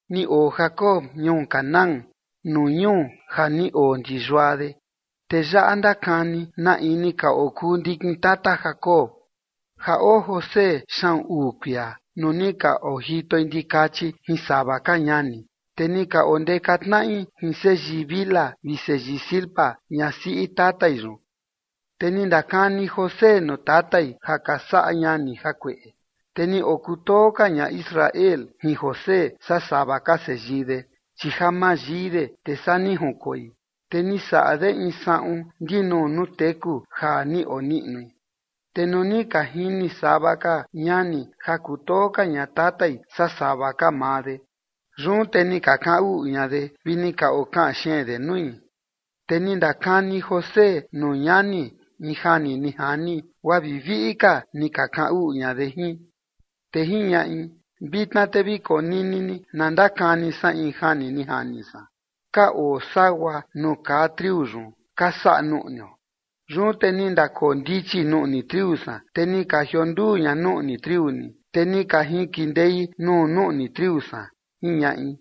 Ni oo Jacob ñuu Canaán nuu ñuu ja ni oo ndi yua de. Te yaꞌa ndakani na in ni ka oo kuu ndikin tata Jacob. Ja oo José xaꞌun uu kuia nuu ni ka ojitoi ndikachi jin sava ka ñani. Te ni ka ondeka tnaꞌi jin seyii Bilha vi seyii Zilpa, ñasiꞌi tatai yun, te ni ndakani José nuu tatai ja ka saꞌa ñani jakueꞌe. Te ni okutoo ka ña Israel jin José saa sava ka seyii de, chi ja mayii de, te saa ni jinkoi, te ni saꞌa de in saꞌun ndinuu nuu teku ja ni oniꞌnui. Te nuu ni ka jini sava ka ñani ja kutoo ka ña tatai saa sava ka maa de, yun te ni ka kaꞌan uꞌu ña de vi ni ka okaꞌan xeen de nui. Te ni ndakani José nuu ñani in jani ni jani, guaa vi viꞌi ka ni ka kaꞌan uꞌu ña de jin. Te jiñaꞌi: ―Vitna te vi konini ni na ndakani san in jani ni jani san. Ka oo sagua nuu kaa triu yun ka saꞌa nuꞌnio, yun te ni ndakoo ndichi nuꞌni triu san, te ni ka jionduu ña nuꞌni triu ni, te ni ka jinkindei nuu nuꞌni triu san ―jiñaꞌi.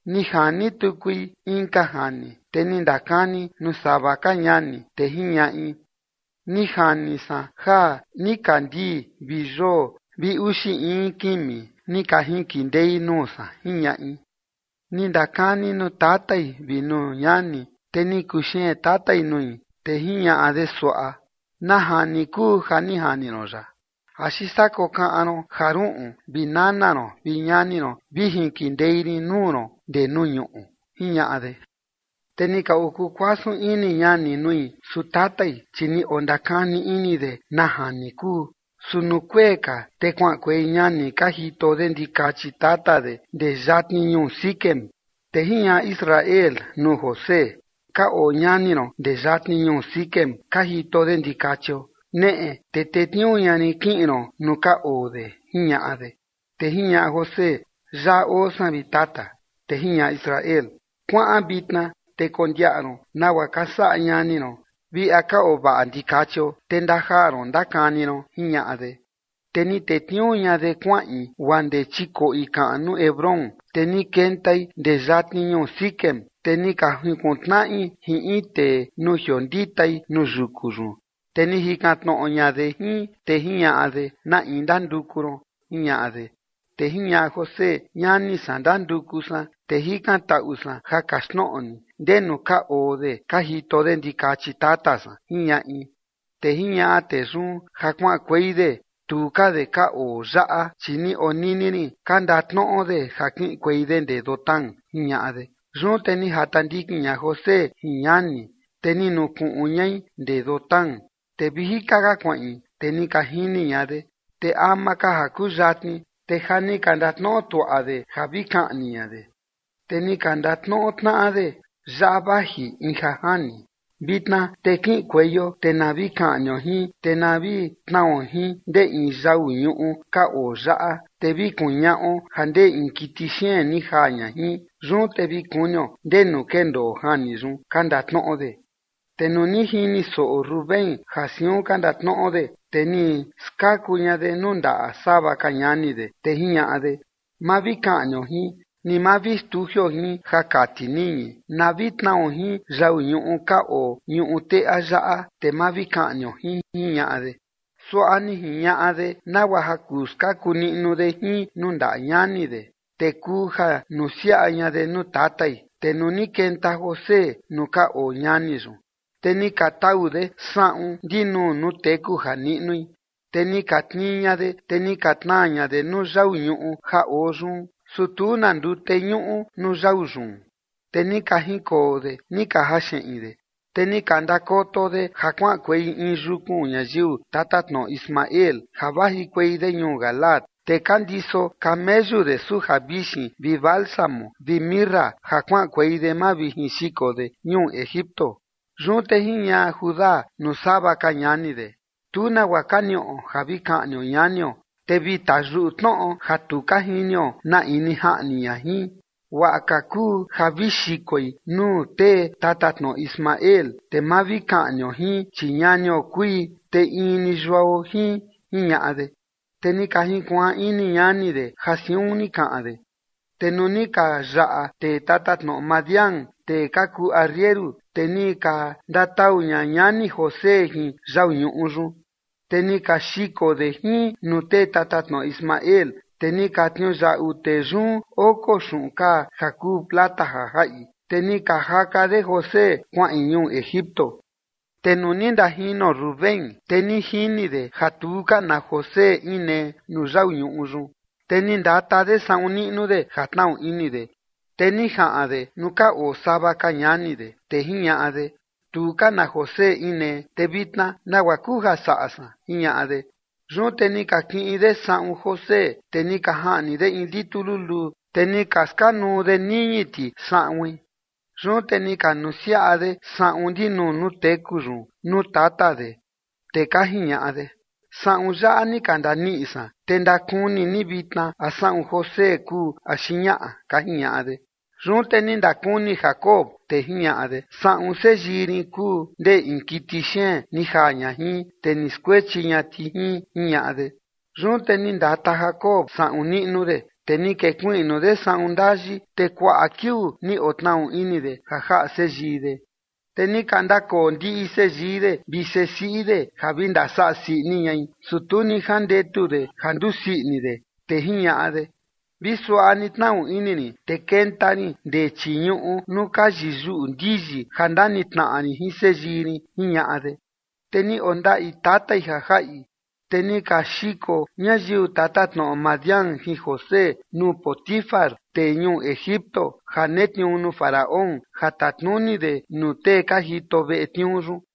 Ni jani tukui inka jani, te ni ndakani nuu sava ka ñani, te jiñaꞌi: ―Ni jani san ja nikandii vi yoo vi uxi in kimi ni ka jinkindei nuu san ―jiñaꞌi. Ni ndakani nuu tatai vi nuu ñani, te ni kuxeen tatai nui, te jiñaꞌa de suaꞌa: ―¿Na jani kuu ja ni jani ron yaꞌa? ¿Axi saa kokaꞌan ron ja ruꞌun vi nana ron vi ñani ron vi jinkindei rin nuu ron ndee nuu ñuꞌu? ―jiñaꞌa de. Te ni ka okuu kuasun ini ñani nui, su tatai, chi ni ondakani ini de na jani kuu. Su nuu kuee ka te kuaꞌankuei ñani ka jito de ndikachi tata de ndee yatni ñuu Siquem. Te jiñaꞌa Israel nuu José: ―Ka oo ñani ron ndee yatni ñuu Siquem ka jito de ndikachio. Neꞌe te tetniuu ña rin kiꞌin ron nuu ka oo de ―jiñaꞌa de. Te jiñaꞌa José: ―Yaꞌa oo san, vi tata. Te jiñaꞌa Israel: ―Kuaꞌan vitna te kondiaꞌa ron nagua ka saꞌa ñani ron vi a ka oo vaꞌa ndikachio, te ndajaa ron ndakani ron ―jiñaꞌa de. Te ni tetniuu ña de kuaꞌin guaa ndee chikoꞌi kaꞌnu Hebrón. Te ni kentai ndee yatni ñuu Siquem. Te ni ka junkuntnaꞌi jin in tee nuu jionditai nuu yuku yun, te ni jikan tnoꞌo ña de jin, te jiñaꞌa de: ―¿Na in ndanduku ron? ―jiñaꞌa de. Te jiñaꞌa José: ―Ñani san ndanduku san, te jikantaꞌu san ja kaxtnoꞌo ni ndenu ka oo de ka jito de ndikachi tata san ―jiñaꞌi. Te jiñaꞌa tee yun: ―Ja kuaꞌankuei de, tu ka de ka oo yaꞌa, chi ni onini rin ka ndatnoꞌo de ja kiꞌinkuei de ndee Dotán ―jiñaꞌa de. Yun te ni jata ndikin ña José jin ñani, te ni nukuꞌun ñai ndee Dotán. Te vi jika ka kuaꞌin, te ni ka jini ña de, te ama ka ja kuyatni, te ja ni ka ndatnoꞌo tuaꞌa de ja vi kaꞌni ña de. Te ni ka ndatnoꞌo tnaꞌa de: ―Yaꞌa vaji in ja jani. Vitna te kiꞌinkueio te na vi kaꞌnio jin, te na vi tnao jin ndee in yau ñuꞌu ka oo yaꞌa, te vi kuñaꞌo ja ndee in kiti xeen ni jaa ña jin. Yun te vi kunio ndenu kendoo jani yun ―ka ndatnoꞌo de. Te nuu ni jini soꞌo Rubén ja siun ka ndatnoꞌo de, te ni skaku ña de nuu ndaꞌa sava ka ñani de, te jiñaꞌa de: ―Ma vi kaꞌnio jin. Ni ma vi xtujioo jin ja kati niñi, na vi tnao jin yau ñuꞌu ka oo ñuꞌu teꞌa yaꞌa, te ma vi kaꞌnio jin ―jiñaꞌa de. Suaꞌa ni jiñaꞌa de nagua ja kuu skaku niꞌnu de jin nuu ndaꞌa ñani de, te kuu ja nusiaꞌa ña de nuu tatai. Te nuu ni kenta José nuu ka oo ñani yun, te ni ka tau de saꞌun ndinuu nuu teku ja niꞌnui. Te ni ka tnii ña de, te ni ka tnaa ña de nuu yau ñuꞌu ja oo yun, su tu na ndute ñuꞌu nuu yau yun. Te ni ka jinkoo de ni ka jaxeꞌin de, te ni ka ndakoto de ja kuaꞌankuei in yukun ñayiu tatatnoꞌo Ismael ja vajikuei de ñuu Galaad, te ka ndiso kameyu de suja vixin vi bálsamo vi mirra, ja kuaꞌankuei de mavijinxiko de ñuu Egipto. Yun te jiñaꞌa Judá nuu sava ka ñani de: ―Tu nagua ka niꞌo ja vi kaꞌnio ñanio, te vi tayuꞌu tnoꞌo ja tu ka jinio na in ni jaꞌni ña jin. Guaꞌa ka kuu ja vi xikoi nuu tee tatatnoꞌo Ismael, te ma vi kaꞌnio jin, chi ñanio kui, te in ni yuao jin ―jiñaꞌa de. Te ni ka jinkuaan ini ñani de ja siun ni kaꞌan de. Te nuu ni ka yaꞌa tee tatatnoꞌo Madián, tee ka kuu arrieru, te ni ka ndatau ña ñani José jin yau ñuꞌu yun, te ni ka xiko de jin nuu tee tatatnoꞌo Ismael, te ni ka tniuyaꞌu tee yun oko xuꞌun kaa ja kuu plata ja jaꞌi, te ni ka jaka de José kuaꞌin ñuu Egipto. Te nuu ni ndajino Rubén, te ni jini de ja tu ka na José inee nuu yau ñuꞌu yun, te ni ndata de saꞌun niꞌnu de, ja tnaꞌu ini de. Te ni jaꞌan de nuu ka oo sava ka ñani de, te jiñaꞌa de: ―Tu ka na José inee, te vitna, ¿nagua kuu ja saꞌa san? ―jiñaꞌa de. Yun te ni ka kiꞌin de saꞌun José, te ni ka jaꞌni de in litu luluu, te ni ka skanuu de niñi ti saꞌuin. Yun te ni ka nusiaꞌa de saꞌun ndinuu nuu teku yun nuu tata de, te ka jiñaꞌa de: ―Saꞌun yaꞌa ni ka ndaniꞌi san, te ndakuni ni vitna a saꞌun José kuu axi ñaꞌa ―ka jiñaꞌa de. Yun te ni ndakuni Jacob, te jiñaꞌa de: ―Saꞌun seyii rin kuu, ndee in kiti xeen ni jaa ña jin, te ni skuechi ña ti jin ―jiñaꞌa de. Yun te ni ndata Jacob saꞌun niꞌnu de, te ni kekuiꞌnu de saꞌun ndayi, te kuaꞌa kiuu ni otnaꞌu ini de ja jaꞌa seyii de. Te ni ka ndakoo ndiꞌi seyii de vi sesiꞌi de ja vi ndasaꞌa sii ini ñai, su tu ni jandetu de ja nduu sii ini de, te jiñaꞌa de: ―Vi suaꞌa ni tnaꞌu ini rin, te kenta rin ndee chii ñuꞌu nuu ka yiyuꞌu ndiyi ja ndanitnaꞌa rin jin seyii rin ―jiñaꞌa de. Te ni ondaꞌi tatai ja jaꞌi. Te ni ka xiko ñayiu tatatnoꞌo Madián jin José nuu Potifar, tee ñuu Egipto ja netniuu nuu Faraón, ja tatnuni de nuu tee ka jito veꞌe tniuu yun.